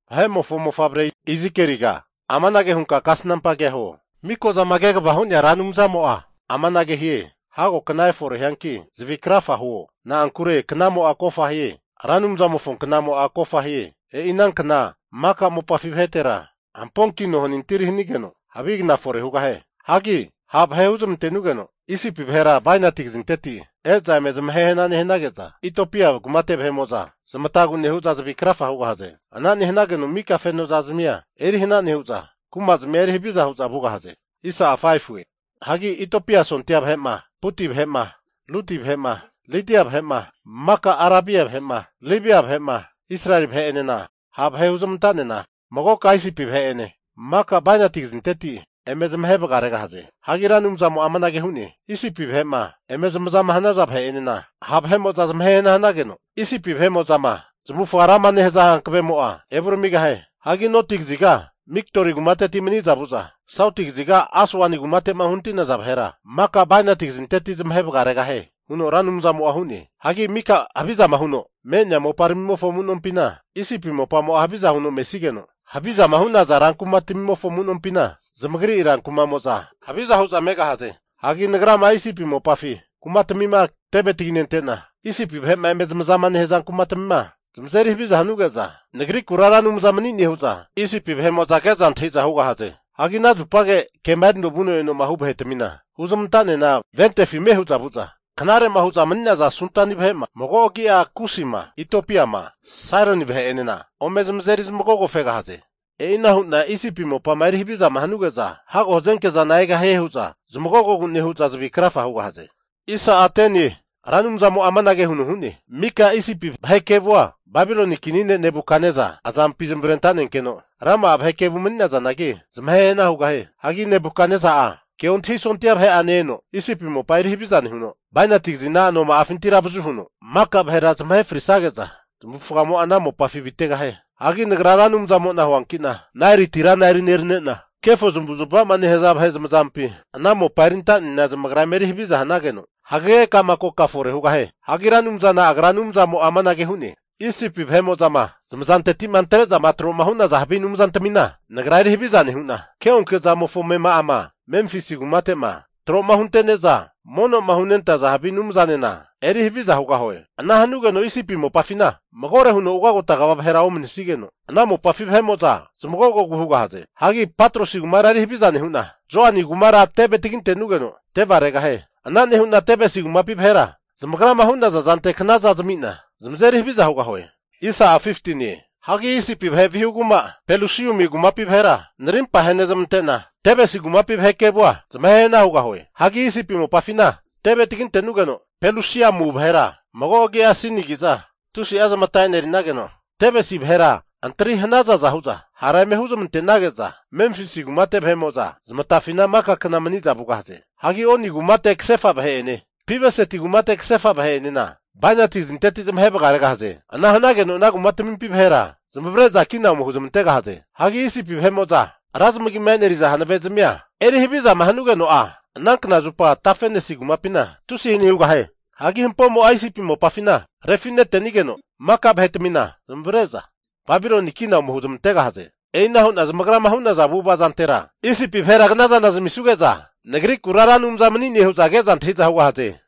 Vahe'mofo mofavre Izikieliga amanage hunka kasnampa kea huo, Mikozama Kegavama Hu'nea Ra Anumzamo'a amanage hie, Hago kna efore hianki, zavi krafa huo. Na'ankure knamo'a kofa hie, Ra Anumzamofo knamo'a kofa hie. E'i anankna maka mopafi vahetera hamponkino hanintiri hanigeno havi kna fore hugahie. Hagi ha' vahe huzmante'nugeno Isipi vahera bainati kazinteti e'za eme zamahehana nehanage'za, Itiopia kumate vahe'mo'za zamatagu nehu'za zavi krafa hugahaze. Ana nehanageno mika fenozazmia erihana nehu'za kumazmia eri haviza hu'za vugahaze. Hagi Itiopia sondia vahe'ma, Puti vahe'ma, Ludi vahe'ma, Lidia vahe'ma, maka Arabia vahe'ma, Libia vahe'ma, Israeli vahe'enena ha' vahe huzmantanena magoka Isipi vahe'ene maka bainati kazinteti eme zamahe vagaregahie. Hagi Ra Anumzamo'a amanage hu'ne, Isipi vahe'ma eme zamazama hanaza vahe'enena ha' vahe'mo'za zamahe hana hanageno, Isipi vahe'mo'zama zamavufaga rama nehaza hankavemo'a evuramigahie. Hagi noti kaziga Migdoli kumateti maniza vu'za sauti kaziga Aswani kumate'ma uhanati'naza vahera maka bainati kazinteti zamahe vagaregahie, huno Ra Anumzamo'a hu'ne. Hagi mika havizama huno me'nea moparamimofo amu'nompina Isipi mopamo'a haviza huno mesigeno, havizama hu'naza rankumatamimofo amu'nompina zamagri rankuma'mo'za haviza hu'za megahaze. Hagi Nagrama Isipi mopafi kumatamima teve taginente'na, Isipi vahe'ma eme zamazama nehaza kumatamima zamazeri havizama hanuge'za, Nagrikura Ra Anumza mani'ne hu'za Isipi vahe'mo'za ke'za antahi'za hugahaze. Hagi ana zupage kema erino vuno eno'ma hu vahetami huzmanta'nena ventefi ame' hu'za vu'za, knare hu'za mani'naza Sudani vahera (mago'a agia Kusima, Itiopiama, Sairini) vahe'enena ome zamazeri zamagogo fegahaze. E'ina hu'na Isipi mopama eri havizama hanuge'za, hago hazenke zana egahie hu'za zamagogogura nehu'za zavi krafa hugahaze. Ra Anumzamo'a amanage hu'ne, mika Isipi vahe kevua Babiloni kini ne' Nebukatnesa azampi zamavarenta'nenkeno, rama'a vahe kevu mani'nazanagi zamahe hana hugahie. Hagi Nebukatnesa'a keontahi sondia vahe'ane eno Isipi mopa eri haviza nehuno, bainati kazina anoma'afinti avazu huno maka vahera zamahe frisage'za zamavufagamo'a ana mopafina avitegahie. Hagi Nagra Ra Anumzamo'na huankina, Naeli tirana eri nerane'na, kefo zmavuzmava'ma nehaza vahe zamazampi ana mopa erinta'nena zamagra eme eri haviza hanageno hagege ka'ma koka fore hugahie. Hagi Ra Anumzana Agra Anumzamo'a amanage hu'ne, Isipi vahe'mo'zama zamazanteti'ma antre'za tro'ma hu'naza havi anumzantamina Nagra eri haviza nehu'na, keonke'zamofo amema'ama Memfisi kumate'ma tro'ma hunte'ne'za mono'ma hunentaza havi anumzanena eri haviza hugahue. Ana hanugeno Isipi mopafina magore huno ugagota kva vahera omanisigeno, ana mopafi vahe'mo'za zmagogogu hugahaze. Hagi Patrosi kumara eri haviza nehu'na, Zoani kumara teve taginte'nugeno teveregahie. Ana nehu'na Tebesi kumapi vahera zamagrama hu'naza zantera knaza zami'na zamazeri haviza Hagi Isipi vahe vihu kuma Pelusiumi kumapi vahera narimpama ahenezmante'na, Tebesi kumapi vahe kevua zamahe hana hugahue. Hagi Isipi mopafina teve tagintenugeno, Pelusiumua vahera (mago agi'a Sinigi'za) tusi'a zamata eneri'nageno, Tebesi vahera antri hanazaza hu'za hara eme hunezmante'nage'za, Memfisi kumate vahe'mo'za zamatafina maka kna mani'za vugahaze. Hagi Oni kumate kasefa vahe'ene, Pi-beseti kumate kasefa vahe'enena bainati kazinteti zamahe vagaregahaze. Ana hanageno ana kumatamimpi vahera zamavare'za kina ome huzmantegahaze. Hagi Isipi vahe'mo'za ra zamagima eneriza hanave'zmia eri havizama hanugeno'a, anankna zupa Tafenesi kumapina tusi hani hugahie. Hagi hampomo'a Isipi mopafina refite'nigeno maka vahetamina zamavare'za, Babiloni kina ome huzmantegahaze. E'ina hu'na zamagrama hu'naza avu'ava zantera Isipi vahera kna zana zamisuge'za, Nagrikura Ra Anumza mani'ne hu'za ke'za antahi'za hugahaze.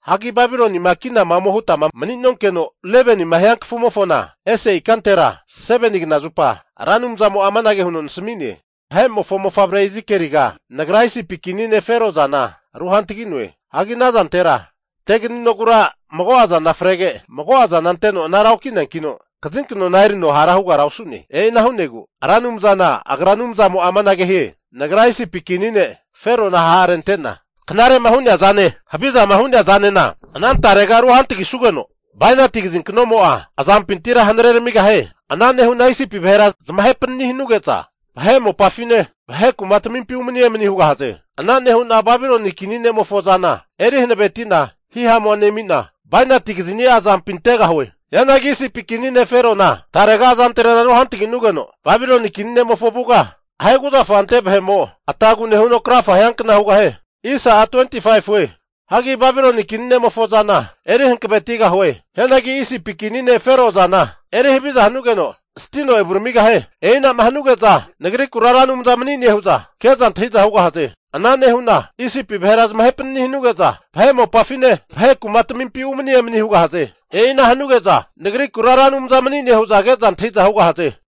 Hagi Babilonima kinama ome hutama mani'nonkeno, 11nima hiankafumofona ese ikantera 7ni knazupa Ra Anumzamo'a amanage huno nasami'ne. Vahe'mofo mofavre Izikieliga, Nagra Isipi kini ne' Fero azana ru hantagi'noe. Hagi ana azantera teganinogura mago'a zana frege mago'a zana anteno anara oki'neankino, kazinknona erino hara hugara osu'ne. E'ina hu'negu Ra Anumzana Agra Anumzamo'a amanage hie, Nagra Isipi kini ne' Ferona ha'rente'na knare'ma hu'nea azane, havizama hu'nea azanena anantarega ruhantagisugeno bainati kazinknomo'a azampintira hanareramigahie. Ana nehu'na Isipi vahera zamahe panani hanuge'za, vahe mopafine vahe kumatamimpi umani emani hugahaze. Ana nehu'na Babiloni kini ne'mofo azana eri hanaveti'na hihamua nemina bainati kazini'a azampi antegahue. Hianagi Isipi kini ne' Ferona tarega azantrena ru hantaginugeno Babiloni kini ne'mofo avuga ahe kuzafa ante vahe'mo atagu nehuno krafa hiankna hugahie. Hagi Babiloni kini ne'mofo azana, eri hanavetigahue. Hianagi Isipi kini ne' Fero azana eri haviza hanugeno stino evuramigahie. E'inama hanuge'za Nagrikura Ra Anumza mani'ne hu'za ke'za antahi'za hugahaze. Ana nehu'na Isipi vahera zamahe panani hanuge'za, vahe mopafine, vahe kumatamimpi umani emani hugahaze. E'ina hanuge'za Nagrikura Ra Anumza mani'ne hu'za ke'za antahiza hugahaze.